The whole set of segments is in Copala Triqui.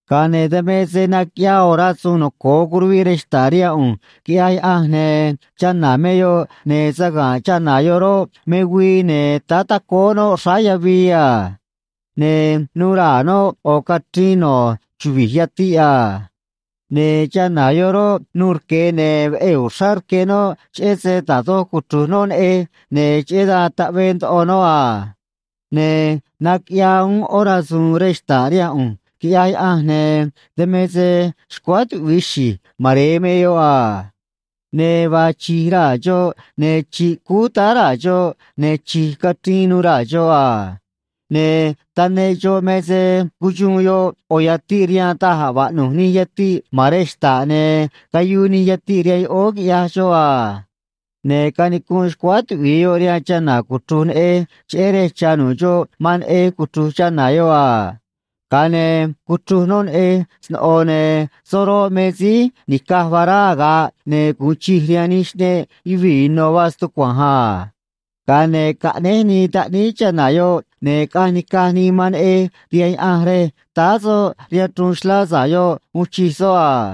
Ga̱a ne̱ dan me se naquiꞌyaa ꞌo̱ rasu̱u̱n noco̱o curuviꞌ rej xta̱ꞌ rihaan ꞌu̱nj, quiꞌyaj Yaꞌanj, ne̱ chana̱ me yoꞌ, ne̱ saga̱nꞌ chana̱ yoꞌ roꞌ, me güii, ne̱ táá tacóó noꞌ xráá yavii a. Ne̱ nu̱u̱ raa̱ noꞌ ꞌo̱ cachriin no̱ chuvi̱j yatiꞌ a. Ne̱ chana̱ yoꞌ roꞌ, nuû rque, ne̱ veꞌee̱ uxrá rque noꞌ cheꞌé se da̱j doj cuchru̱j noꞌ neꞌej, ne̱ cheꞌé dan taꞌvee ndoꞌo noꞌ a. Ne̱ naquiꞌyaa uún ꞌó rasu̱u̱n rej xta̱ꞌ rihaan ꞌu̱nj, quiꞌyaj Yaꞌanj, ne̱ dan me se xcuáá tuꞌvi̱i xi̱j mare̱e me yoꞌ a. Ne̱ vaa chi̱j raa̱ xoꞌ, ne̱ chi̱ꞌ cúú táá raa̱ xoꞌ, ne̱ chi̱j cachriin nuû raa̱ xoꞌ a. Ne̱ taneꞌ xoꞌ me se cuxuun yoꞌ ꞌo̱ yatiꞌ rihaan da̱j a̱ vaꞌnu̱j nij yatiꞌ ma̱n rej xta̱ꞌ, ne̱ cayuu nij yatiꞌ rihaan yoꞌóó, quiꞌyaj xoꞌ a. Ne̱ canicunꞌ xcuáá tuꞌvi̱i yoꞌ rihaan chana̱ cuchru̱j neꞌej, cheꞌé rej cha̱ nu̱ꞌ xoꞌ man neꞌej cuchru̱j chana̱ yoꞌ a. Ga̱a ne̱ cuchruj noꞌ neꞌej sno̱ꞌo, ne̱ soꞌ roꞌ, me síí ni̱caj vará aga̱ꞌ ne̱ gu̱un chij rihaan nij xꞌneꞌ yuvii̱ ino̱ vaa stucua̱nj a. Ga̱a ne̱ caꞌnéj nii taꞌníí chana̱ yoꞌ, ne̱ caꞌanj nica̱j nii man neꞌej rihaan Yaꞌanj rej táá soꞌ rihaan chruun xlá sa̱ꞌ yoꞌ uun chij soꞌ a.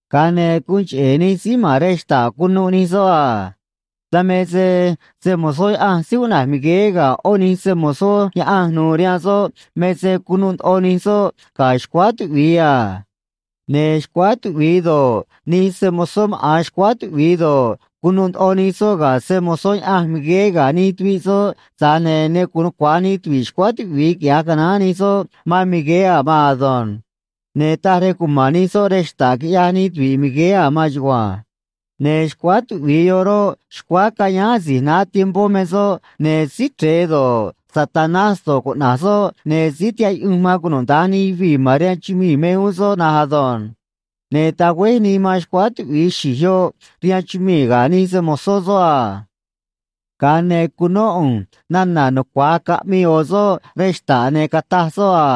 Ga̱a ne̱ guun cheꞌe̱ nij síí ma̱n rej xta̱ꞌ cunuꞌ nij soꞌ a. Dan me se se‑mo̱zó Yaꞌanj síí cuꞌna̱j Migueé ga̱ ꞌó nij se‑mo̱zó Yaꞌanj nu̱u̱ rihaan soꞌ me se cunuꞌ ndoꞌo nij soꞌ ga̱ xcuáá tuꞌvi̱i a. Ne̱ xcuáá tuꞌvi̱i do̱ꞌ, nij se‑mo̱zó maꞌa̱n xcuáá tuꞌvi̱i do̱ꞌ, cunuꞌ ndoꞌo nij soꞌ ga̱ se‑mo̱zó Yaꞌanj Migueé ga̱ nij tuviꞌ soꞌ, tza̱j ne̱ ne gu̱un nucua̱j nij tuvi̱ꞌ xcuáá tuꞌvi̱i quiꞌya̱j canaán nij soꞌ man Migueé a̱ maan ado̱nj. Ne̱ taj rej cuma̱n nij soꞌ rej xta̱ꞌ, quiꞌyaj nij tuvi̱ꞌ Migueé a̱ maan chugua̱nj. Ne̱ xcuáá tuꞌvi̱i yoꞌ roꞌ, xcuáá cayáán asi̱j naá tiempó me soꞌ, ne̱ Síí Chre̱e do̱ꞌ, Satanás do̱ꞌ, cuꞌna̱j soꞌ, ne̱ síí tihaꞌ yuꞌunj man cunuda̱nj nij yuvii̱ ma̱n rihaan chumii̱ me uún soꞌ na̱nj ado̱nj. Ne̱ tagüéj nii man xcuáá tuꞌvi̱i xi̱j yoꞌ rihaan chumii̱ ga̱ nij se‑mo̱zó soꞌ a. Ga̱a ne̱ cunó ꞌu̱nj nana̱ nucua̱j caꞌmii ꞌo̱ soꞌ rej xta̱ꞌ, ne̱ cataj soꞌ a: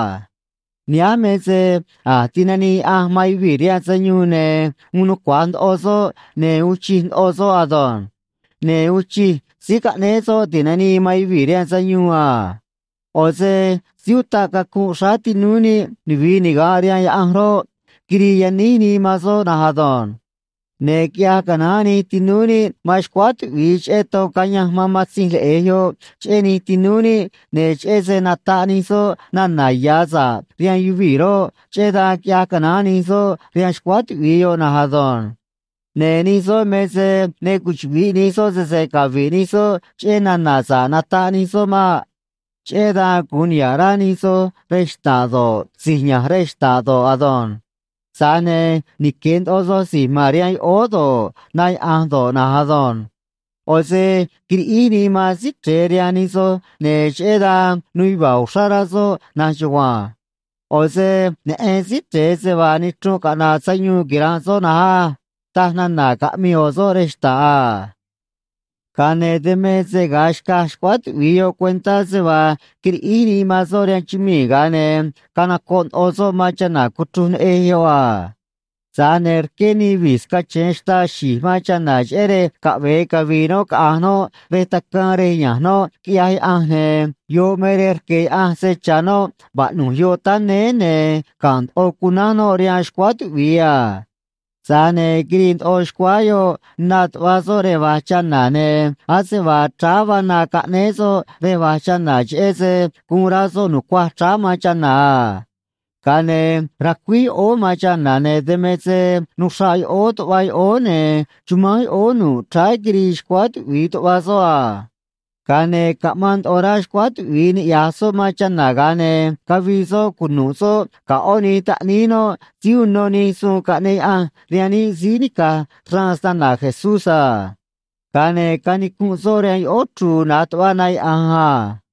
Nihánj me se a̱j tinanii Yaꞌanj man yuvii̱ rihaan sayuun, ne̱ uun nucua̱j ndoꞌo soꞌ, ne̱ uun chij ndoꞌo soꞌ ado̱nj. Ne̱ uun chij Síí Caꞌnéé Soꞌ Ti̱nanii man Yuvii̱ rihaan Sayuun a. ꞌO̱ se síí utaꞌ cacunꞌ xráá tinúú níꞌ nuvi̱i niga̱nꞌ rihaan Yaꞌanj roꞌ, quirii yaníj nii man soꞌ na̱nj ado̱nj. Ne̱ quiꞌyaj canaán nij tinúú níꞌ man xcuáá tuꞌvi̱i cheꞌé ton cayanj man Matzinj Leꞌe̱j yoꞌ cheꞌé nij tinúú níꞌ, ne̱ cheꞌé se nataꞌ nij soꞌ nana̱ ya̱ sa̱ꞌ rihaan yuvii̱ roꞌ, cheꞌé dan quiꞌyaj canaán nij soꞌ rihaan xcuáá tuꞌvi̱i yoꞌ na̱nj ado̱nj. Ne̱ nij soꞌ me se ne cuchuꞌvi̱ꞌ nij soꞌ sese cavi̱ꞌ nij soꞌ cheꞌé nana̱ sa̱ꞌ nataꞌ nij soꞌ maꞌ. Cheꞌé dan gu̱un niha̱ꞌ rá nij soj re̱j xta̱ꞌ do̱ꞌ, si̱j ya̱nj rej xta̱ꞌ do̱ꞌ ado̱nj. Tza̱j ne̱ nique̱ ndoꞌo soj si̱j ma̱n rihaan yoꞌóó do̱ꞌ, na yaꞌa̱nj do̱ꞌ na̱nj ado̱nj. ꞌO̱ se quiriꞌíj nii man Síí Chre̱e rihaan nij so̱j, ne̱ cheꞌé dan nuu yuva̱a̱ uxrá rá soꞌ na̱nj chugua̱nj. ꞌO̱ se neꞌen Síí Chre̱e se vaa nichrunꞌ caꞌna̱ꞌ sayuun quira̱nꞌ soꞌ na̱nj á, taj nana̱ caꞌmii ꞌo̱ soꞌ rej xta̱ꞌ a. Ga̱a ne̱ dan me se ga̱a xcaj xcuáá tuꞌvi̱i yoꞌ cuentá se vaa quiriꞌíj nii man soꞌ rihaan chumii̱, ga̱a ne̱ canocoꞌ ndoꞌo soꞌ man chana̱ cuchruj neꞌej yoꞌ a. Tza̱j ne̱ rqué nii vi̱j scache̱e xtaa xi̱j man chana̱, cheꞌé rej caꞌve̱e cavi̱i̱ noꞌ caꞌa̱nj noꞌ rej tacaan rej ya̱nj noꞌ quiꞌyaj Yaꞌanj, ne̱ yoꞌ me rej rque̱ Yaꞌanj se cha̱ noꞌ vaꞌnu̱j yoꞌ táá néé, ne̱ ga̱nꞌ ndoꞌo cunánj noꞌ rihaan xcuáá tuꞌvi̱i a. Tza̱j ne̱ quirii ndoꞌo xcuáá yoꞌ na tuꞌva soꞌ rej va̱j chana̱, ne̱ ase vaa chráá vaa na caꞌnéé soꞌ rej va̱j chana̱, cheꞌé se guun rá soꞌ nu̱cuaj chráá man chana̱ a. Ga̱a ne̱ racuíj yoꞌóó man chana̱, ne̱ dan me se nuxraꞌ yoꞌóó tuꞌva yoꞌóó, ne̱ chumánj yoꞌóó nu̱ꞌ chráá quirii xcuáá tuꞌvi̱i tuꞌva soꞌ a. Ga̱a ne̱ caꞌmaan ndoꞌo rá xcuáá tuꞌvi̱i niꞌya̱j soꞌ man chana̱, ga̱a ne̱ cavii soꞌ cunu̱ꞌ soꞌ ga̱ ꞌó nij taꞌníí noꞌ síí uno nij suun caꞌneꞌ Yaꞌanj rihaan níꞌ, síí nica̱j xraan snana̱ Jesús a. Ga̱a ne̱ canicunꞌ soꞌ rihaan yoꞌóó chru̱u̱ na̱j tuꞌva na yaꞌa̱nj a.